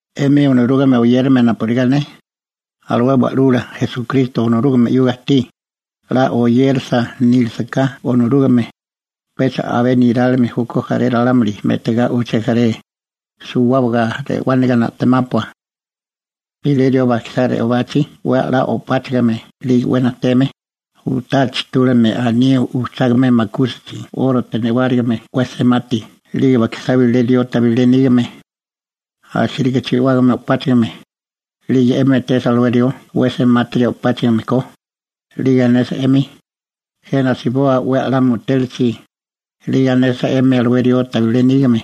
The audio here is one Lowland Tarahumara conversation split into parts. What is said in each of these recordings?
'Emi Onorúgame oyérame napurigá ne, alué Wa'lula Esukristo Onorúgame 'yuga ajtí, 'la oyérasa nílisaká Onorúgame, pecha abé nerálime júkó jaré ralámuli me'tigá uché jaré, suwábaga re'wániga na'temápua. Bilé rió bajkisá re'obachi 'we 'la o'páchigime 'lige 'we najteme u'tá chijtúlame anío ujchágame makúsachi 'órote newárigime 'we semati 'lige bajkisá bilé rió tabilé nígame, asíriga chi'wágame o'páchigame, 'lige 'emi etesa alué rió 'we semátiri o'páchigime ko, 'lige anesa 'emi: «Jena asiboa 'we a'lá mutélachi», 'lige anesa 'emi alué rió tabilé nígame: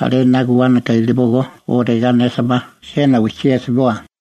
«Alé 'na guwánaka ilibógó», o regá anesa ma: «Jena wijchí asiboa»,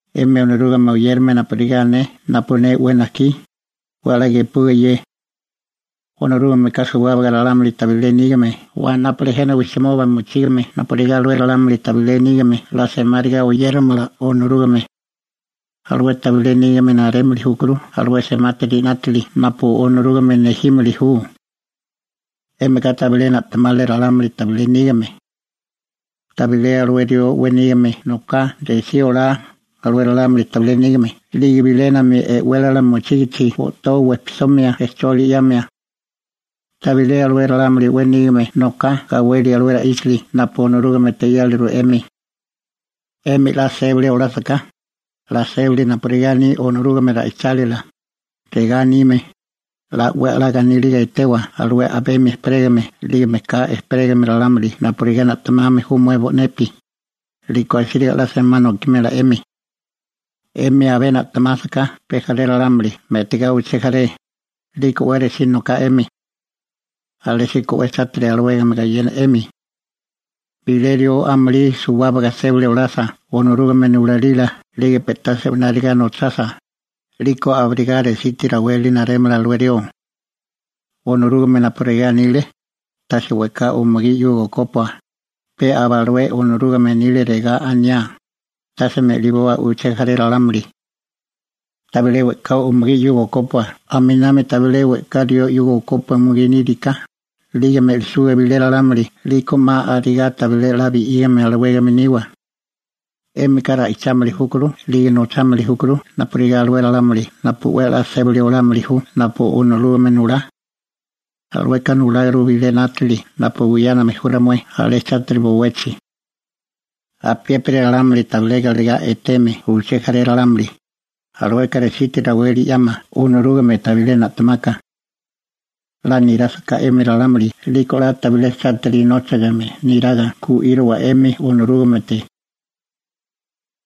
'Emi Onorúgame oyérame napurigá ne napu ne 'we najkí, 'we 'la gepuwa ye. Onorúgameka suwábaga ralámuli tabilé nígame wanápale jena wijchimoba mochígame napurigá alué ralámuli tabilé nígame 'la semáriga oyéramala Onorúgame. Alué tabilé nígame narémili júkuru alué semátiri 'nátili napu Onorúgame nejímili ju. 'Émika tabilé na'temale ralámuli tabilé nígame. ¿Tabilé alué rió 'we nígame noká resí olá alué ralámuli tabilé nígame 'lige bilénami e'wélala mochígichi o'toa wejpisomia rejcholi 'yamia? ¿Tabilé alué ralámuli 'we nígame noká gawelia alué ra'íchali napu Onorúgamete 'yáliru 'emi? 'Emi 'la sébali olásaká, 'la sébali napurigá aní Onorúgame ra'ichálila, regá anime: «'La 'we 'la ganíliga etewa alué a'bemi ejperégame 'lige mejká ejperégame ralámuli napurigá na'temame ju mué bo'nepi», 'liko asíriga 'la semá nokimela 'emi. 'Emi abé na'temásaká pe jaré ralámuli me'tigá uché jaré, 'liko 'we resí noká 'emi. Alésíko 'we chátiri alawégame gayena 'emi. Bilé rió amulí suwábaga sébali olasa Onorúgame nulalila 'lige pe'tá se'wináriga nochasa, 'liko abirigá resiti raweli narémala alué rió. Onorúgame napu regá anile: «Tase we'ká umugí 'yuga okópua», pe aba alué Onorúgame anile regá aniá: «Tase me'liboa uché jaré ralámuli.» Tabilé we'ká umugí 'yuga okópua aminami tabilé we'ká rió 'yuga okópua umugí níriká, 'lige me'lisuga bilé ralámuli 'liko 'ma abirigá tabilé 'la bi'ígame alawégame niwa. 'Émika ra'ichámili júkuru 'lige nochámili júkuru napurigá alué ralámuli napu 'we 'la sébali olámili ju napu Onorúgame nulá. Alueka nuláguru bilé 'nátili napu buyáname ju ramué alé chátiri bowechi. Apiépiri ralámuli tabilé galegá eteme uché jaré ralámuli, alueka resiti raweli 'yama Onorúgame tabilé na'temaka. 'La nirásaká 'emi ralámuli 'liko 'la tabilé chátiri nóchigame neraga gu'írowa 'emi Onorúgamete.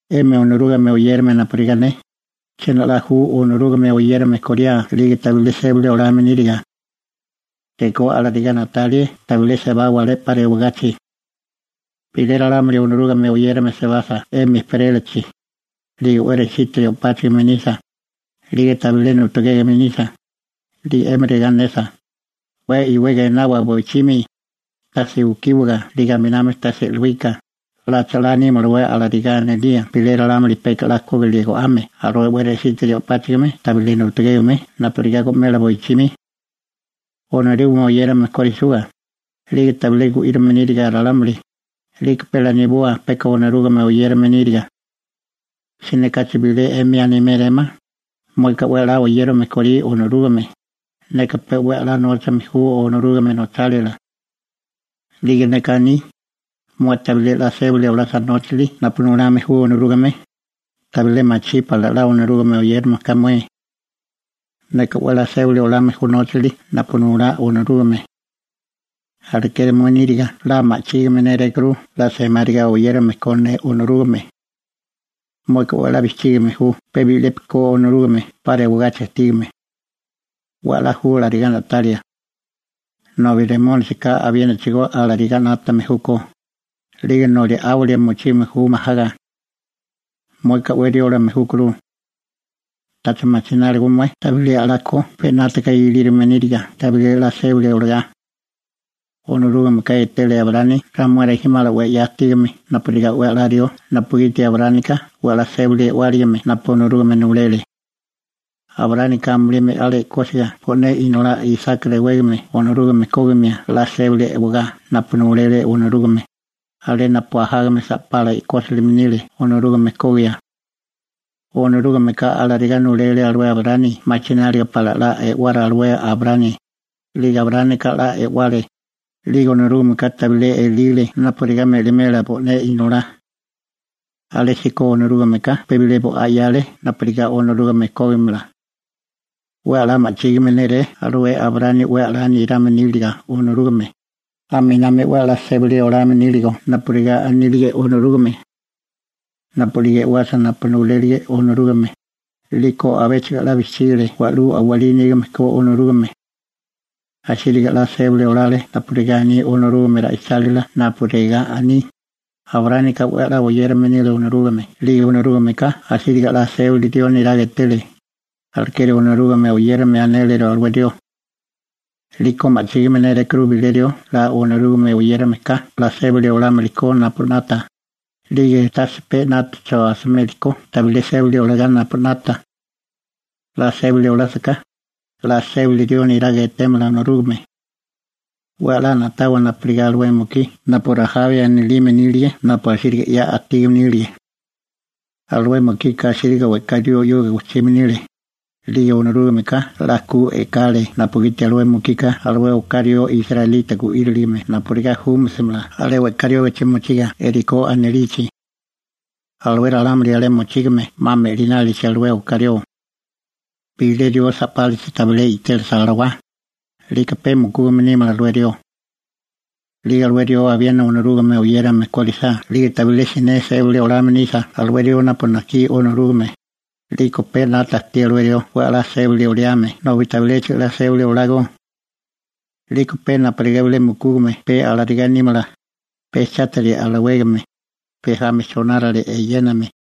'Emi Onorúgame oyérame napurigá ne, ¿chiena 'la ju Onorúgame oyérame koriá 'lige tabilé sébali olame níriga? Rekó alarigá na'talie tabilé sebawa alé 'pa rewagachi. Bilé ralámuli Onorúgame oyérame sebasa 'emi ejperélachi, 'lige 'we resitiri o'páchigime nisa, 'lige tabilé nutugégeme nisa, 'lige 'emi regá anesa: «'We iwega enawa boichimi, tase ukíwiga 'lige aminami tase e'luíka», ¿'lacha 'la nímalawé alarigá anilía bilé ralámuli peka 'la kógilie go'ame alué 'we resitiri o'páchigime tabilé nutugégeme napurigá go'mela boichimi? Onorúgame oyérame korisuga, 'lige tabilé gu'írame níriga ralámuli, 'liko pe laniboa peka Onorúgame oyérame níriga. Siné kachi bilé 'emi animérémá: «Mueka 'we 'la oyérame korí Onorúgame, neka pe 'we 'la nóchame ju Onorúgame nochálila.» 'Lige neka aní: «Mué tabilé 'la sébali olasa nóchali napu nulame ju Onorúgame, tabilé machí pala 'la Onorúgame oyérame ko mué. Neka 'we 'la sébali olame ju nóchali napu nulá Onorúgame, alekeri mué níriga 'la ma'chígime nérékuru 'la semáriga oyérame ko ne Onorúgame.» Mueka 'we 'la bijchígame ju pe bi'lepi ko Onorúgame 'pa rewagachi ajtígame. 'We a'lá ju alarigá na'talia. Nobi Remónisika abienachigo alarigá 'nátame júkó, 'lige noli 'áwilia mochime ju majaga. Mueka 'we riólame júkuru. ¿Tacha machináligo mué tabilé 'la ko pe 'nátaga ilírome níriga tabilé 'la sébali olagá? Onorúgameka etele Abraámi ramué rijimala 'we 'ya ajtígame napurigá 'we a'lá rió napugiti Abraámika 'we 'la sébali e'wáligame napu Onorúgame nulele. Abraámika amulí me'ale e'kósiga bo'né inolá Isaki rewégame Onorúgame kógimia 'la sébali e'wagá napu nulele Onorúgame, alé napu ajágame sa'pala e'kósilime nile Onorúgame kogia. Onorúgameka alarigá nulele alué Abraámi machináliga pala 'la e'wara alué Abraámi, 'lige Abraámika 'la e'wale, 'lige Onorúgameka tabilé elile napurigá me'limela bo'né inolá. Alésíko Onorúgameka pe bilé bo'á 'yale napurigá Onorúgame kógimala. 'We 'la ma'chígame nélé alué Abraámi 'we 'la nirame níliga Onorúgame, aminami 'we 'la sébali olame níligo napurigá anílige Onorúgame. Napu'lige e'wasa napu nulélige Onorúgame, 'liko abéchigo 'la bijchígale wa'lú a'walí nígame ko Onorúgame. Asíriga 'la sébali olale napurigá aní Onorúgame ra'ichálila napu regá aní: «Abraámika 'we 'la oyérame nile Onorúgame 'lige Onorúgameka asíriga 'la sébali rió neraga etele.›› Alekeri Onorúgame oyérame anéliru alué rió. 'Liko ma'chígime nérékuru bilé rió 'la Onorúgame oyérameka 'la sébali olámili ko napu 'nata, 'lige tase pe 'nátacho asimeli ko tabilé sébali olagá napu 'nata. 'La sébali olásaká, 'la sébali rió niraga etémala Onorúgame. 'We 'la na'tawa napurigá alué mukí napu Rajabi anilime nílige napu asíriga 'ya ajtígame nílige. Alué mukika asíriga we'ká rió 'yuga gojchime nile, 'lige Onorúgameka 'la ku e'kale napugiti alué mukika alué oká rió israelita gu'íriligime napurigá júmasimala alé we'ká riógachi mochiga Jerikó anilichi. Alué ralámuli alé mochígame 'ma me'linálichi alué oká rió. Bilé rió sa'pálachi tabilé i'télasa alawá, 'liko pe mukúgame nímala alué rió. 'Lige alué rió abiena Onorúgame oyérame kórisá 'lige tabilé siné sébali olame nisa alué rió napu najkí Onorúgame, 'liko pe 'nata ajtí alué rió 'we 'la sébali oliame nobi tabiléchigo 'la sébali olágó. 'Liko pe napurigá bilé mukúgame pe alarigá nímala, pe chátiri alawégame, pe jami chonárale eyéname.